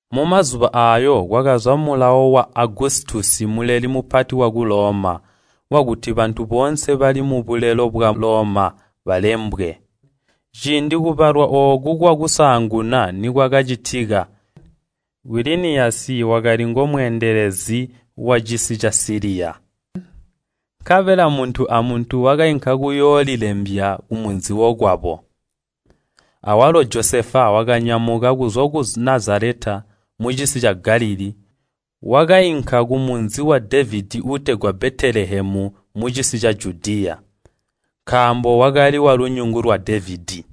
Mumazuba aayo kwakaza mulawo wa Agusitusi Muleli Mupati waku Loma, wakuti bantu boonse bali mubulelo bwa Loma balembwe. Ciindi kubalwa ooku kwakusaanguna nikwakacitika, Kwiliniyasi wakali ngomweendelezi wacisi ca Siliya. Nkabela muntu a muntu wakainka kuyoolilembya kumunzi wokwabo. Awalo Josefa wakanyamuka kuzwa ku Nazaleta mucisi ca Galilii wakainka kumunzi wa Devedi uutegwa Betelehemu mucisi ca Judiya, nkaambo wakali walunyungu lwa Devedi.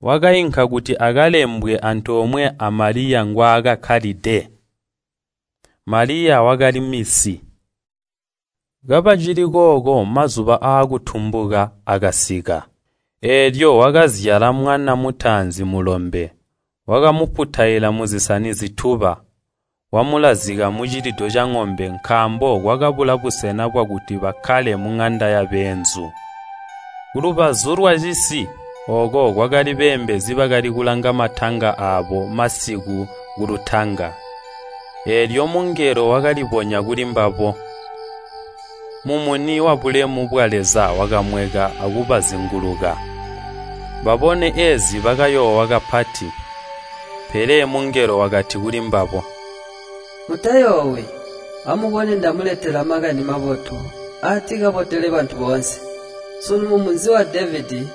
Wakainka kuti akalembwe antoomwe a Maliya ngwaakakkalide. Maliya wakali minsi. Kabacili kooko mazuba aakuzyala akasika. Eelyo wakazyala mwana mutaanzi mulombe, wakamuputaila muzisani zituba, wamulazika mucilido caŋombe, nkaambo kwakabula busena bwakuti bakkale muŋanda yabeenzu. Kulubazu lwacisi ooko kwakali beembezi bakali kulanga matanga aabo masiku kulutanga. Eelyo mungelo wakalibonya kulimbabo, mumuni wabulemu bwa Leza wakamweka akubazinguluka, babone eezi bakayoowa kapati, mungelo wakati kulimbabo, “Mutayoowi, amubone ndamuletela makani mabotu aatikabotele bantu boonse, sunu, mumunzi wa Devedi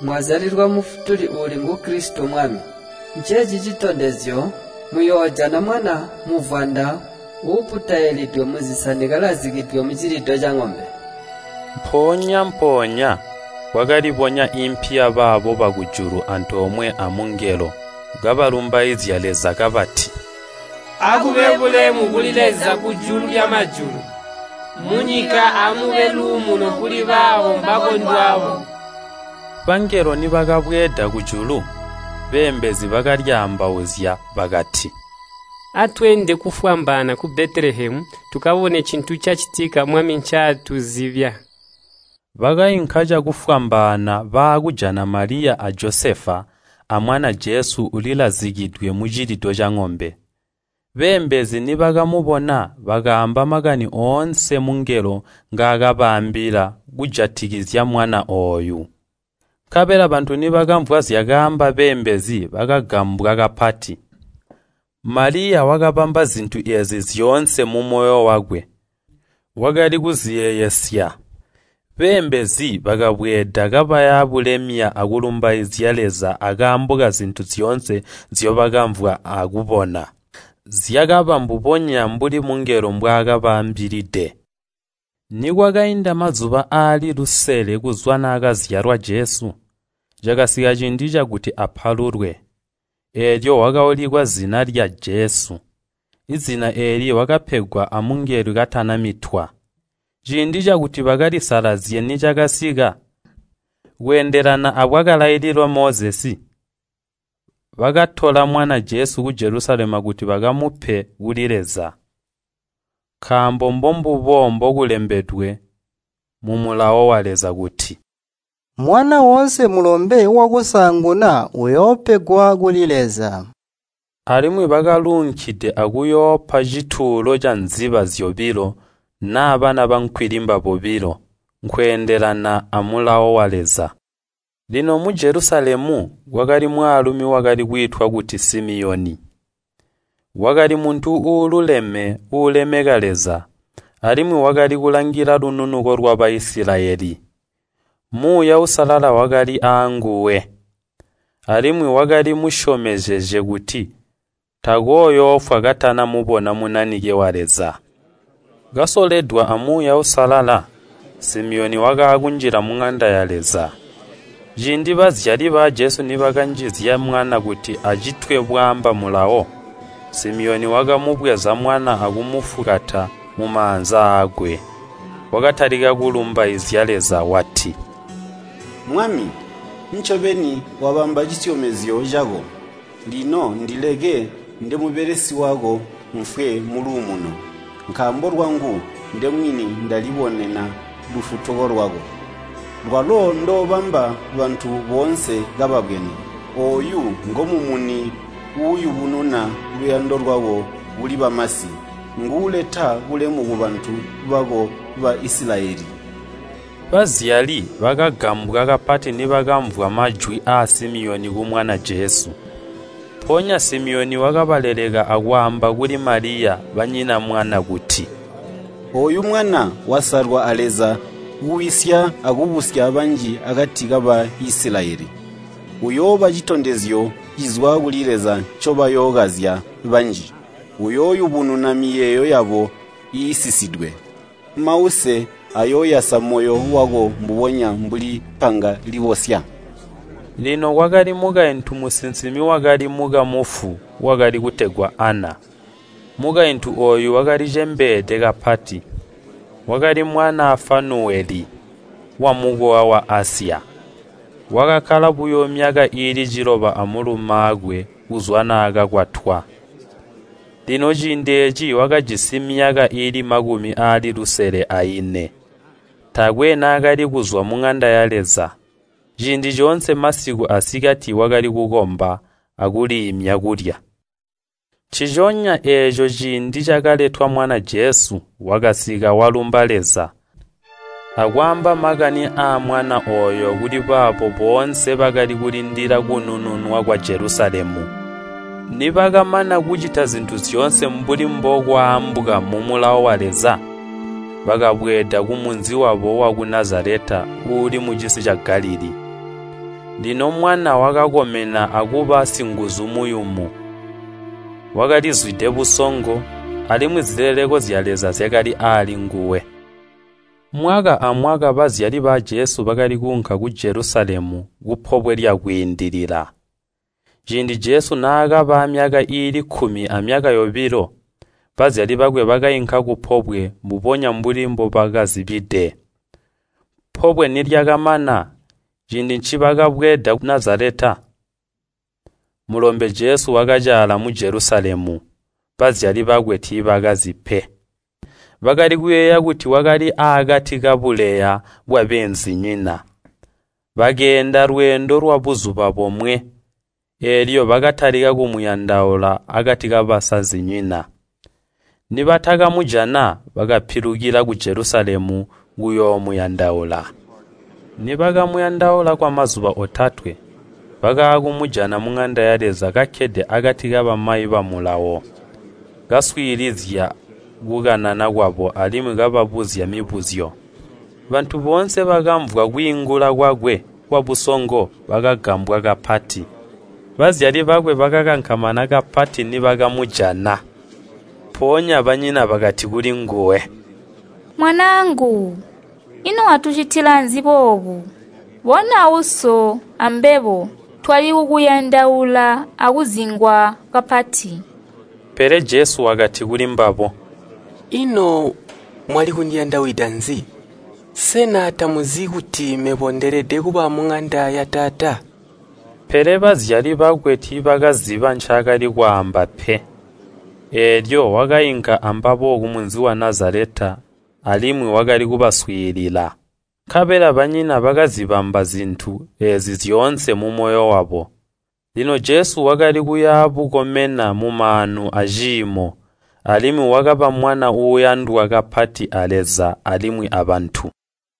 mwazyalilwa Mufutuli uuli ngu Kilisito Mwami. Nceeci citondezyo, muyoojana mwana muvwanda uuputailidwe muzisani kalazikidwe mucilido caŋombe.” Mpoonya-mpoonya kwakalibonya impi yabaabo bakujulu antoomwe amungelo, kabalumbaizya Leza kabati, “Akube bulemu kuli Leza kujulu lyamajulu, munyika amube luumuno akati kabaabo bamukondelezya!” Bangelo nibakabweeda kujulu, beembezi bakalyaambauzya bakati, “Atweende kufwambaana ku Betelehemu, tukabone cintu cacitika Mwami ncaatuzibya.” Bakainka cakufwambaana baakujana Maliya a Josefa, amwana Jesu ulilazikidwe mucilido caŋombe. Beembezi nibakamubona, bakaamba makani oonse mungelo ngaakabaambila kujatikizya mwana ooyu. Nkabela bantu nibakamvwa zyakaamba beembezi bakagambwa kapati. Maliya, wakabamba zintu eezi zyoonse mumoyo wakwe. Wakali kuziyeeyesya. Beembezi bakabweeda kabaya bulemya akulumbaizya Leza akaambo kazintu zyoonse nzyobakamvwa akubona. Zyakaba mbubonya mbuli mungelo mbwaakabaambilide. Nikwakainda mazuba aali lusele kuzwa naakazyalwa Jesu, cakasika ciindi cakuti apalulwe, eelyo wakaulikwa zina lya Jesu, zina eeli wakapegwa amungelo katanamitwa. Ciindi cakuti bakalisalazye nicakasika, kweendelana abwakalailila Mozesi, bakatola mwana Jesu ku Jelusalemu kuti bakamupe kuli Leza. Nkaambo mbombubo mbokulembedwe mumulawo wa Leza kuti, “Mwana woonse mulombe wakusaanguna uyoopegwa kuli Leza.” Alimwi bakaluunkide akuyoopa cituulo canziba zyobilo naa bana bankwilimba bobilo, nkweendelana amulawo wa Leza. Lino mu Jelusalemu kwakali mwaalumi wakali kwiitwa kuti Simiyoni, wakali muntu uululeme uulemeka Leza, alimwi wakali kulangila lununuko lwa Baisilayeli. Muuya Uusalala wakali aanguwe, alimwi wakali musyomezezye kuti takooyoofwa katana mubona Munanike wa Leza. Kasoledwa a Muuya Uusalala, Simiyoni wakaakunjila muŋanda ya Leza. Ciindi bazyali ba Jesu nibakanjizya mwana kuti acitwe bwaamba mulawo, Simiyoni wakamubweza mwana akumufukata mumaanza aakwe, wakatalika kulumbaizya Leza wati, “Mwami, ncobeni wabamba cisyomezyo cako, lino ndileke ndemubelesi wako mfwe muluumuno. Nkaambo lwangu ndemwini ndali bonena lufutuko lwako, lwalo ndoobamba bantu boonse kababwene. Ooyu ngomumuni uuyubununa luyando lwako kuli bamasi, nguuleta bulemu kubantu bako ba Isilayeli.” Bazyali bakagambwa kapati nibakamvwa majwi aa Simiyoni kumwana Jesu. Mpoonya Simiyoni wakabaleleka akwaamba kuli Maliya, banyina mwana kuti, “Ooyu mwana wasalwa a Leza kuwisya akubusya banji akati ka Baisilayeli, uyooba citondezyo cizwa kuli Leza ncobayookazya banji. Uyooyubununa miyeeyo yabo iisisidwe. Mause, ayooyasa moyo wako mbubona mbuli panga libosya.” Lino kwakali mukaintu musinsimi wakali mukamufu wakali kutegwa Ana. Mukaintu ooyu wakalicembeede kapati. Wakali mwanaa Fanuweli, wamukowa wa Asya. Wakakkala buyo myaka iili ciloba amulumaakwe kuzwa naakakwatwa. Lino ciindi eeci wakajisi myaka iili makumi aali lusele aine. Taakwe naakali kuzwa muŋanda ya Leza. Ciindi coonse masiku asikati wakali kukomba akuliimya kulya. Nciconya eeco ciindi cakaletwa mwana Jesu wakasika walumba Leza, akwaamba makani aamwana ooyo kulibaabo boonse bakali kulindila kunununwa kwa Jelusalemu. Nibakamana kucita zintu zyoonse mbuli mbokwaambwa mumulawo wa Leza, bakabweeda kumunzi wabo waku Nazaleta uuli mucisi ca Galilii. Lino mwana wakakomena akuba singuzu muyumu. Wakalizwide busongo, alimwi zileleko zya Leza zyakali alinguwe. Mwaka amwaka bazyali ba Jesu bakali kuunka ku Jelusalemu ku Pobwe lya Kwiindilila. Ciindi Jesu naakaba aamyaka iili kkumi amyaka yobilo, bazyali bakwe bakainka kupobwe mbubonya mbuli mbobakazibide. Pobwe nilyakamana, ciindi ncibakabweeda ku Nazaleta, mulombe Jesu wakacaala mu Jelusalemu. Bazyali bakwe tiibakazi pe. Bakali kuyeeya kuti wakali akati kabuleya bwabeenzinyina. Bakeenda lweendo lwabuzuba bomwe, eelyo bakatalika kumuyandaula akati kabasazinyina. Nibatakamujana, bakapilukila ku Jelusalemu kuyoomuyandaula. Nibakamuyandaula kwamazuba otatwe, bakaakumujana muŋanda ya Leza kakkede akati kabamayi ba mulawo, kaswiilizya kukanana kwabo alimwi kababuzya mibuzyo. Bantu boonse bakamvwa kwiingula kwakwe kwabusongo bakagambwa kapati. Bazyali bakwe bakakankamana kapati nibakamujana. Mpoonya banyina bakati kulinguwe, “Mwanaangu, ino watucitila nzi boobu? Bona uso ambebo twali kukuyandaula akuzingwa kapati.” Pele Jesu wakati kulimbabo, “Ino mwali kundiyandawida nzi? Sena tamuzi kuti mebo ndeelede kuba muŋanda ya Taata?” Pele bazyali bakwe tiibakaziba ncaakali kwaamba pe. Eelyo wakainka ambabo kumunzi wa Nazaleta alimwi wakali kubaswiilila. Nkabela banyina bakazibamba zintu eezi zyoonse mumoyo wabo. Lino Jesu wakali kuyabukomena mumaanu aciimo, alimwi wakaba mwana uuyandwa kapati a Leza alimwi abantu.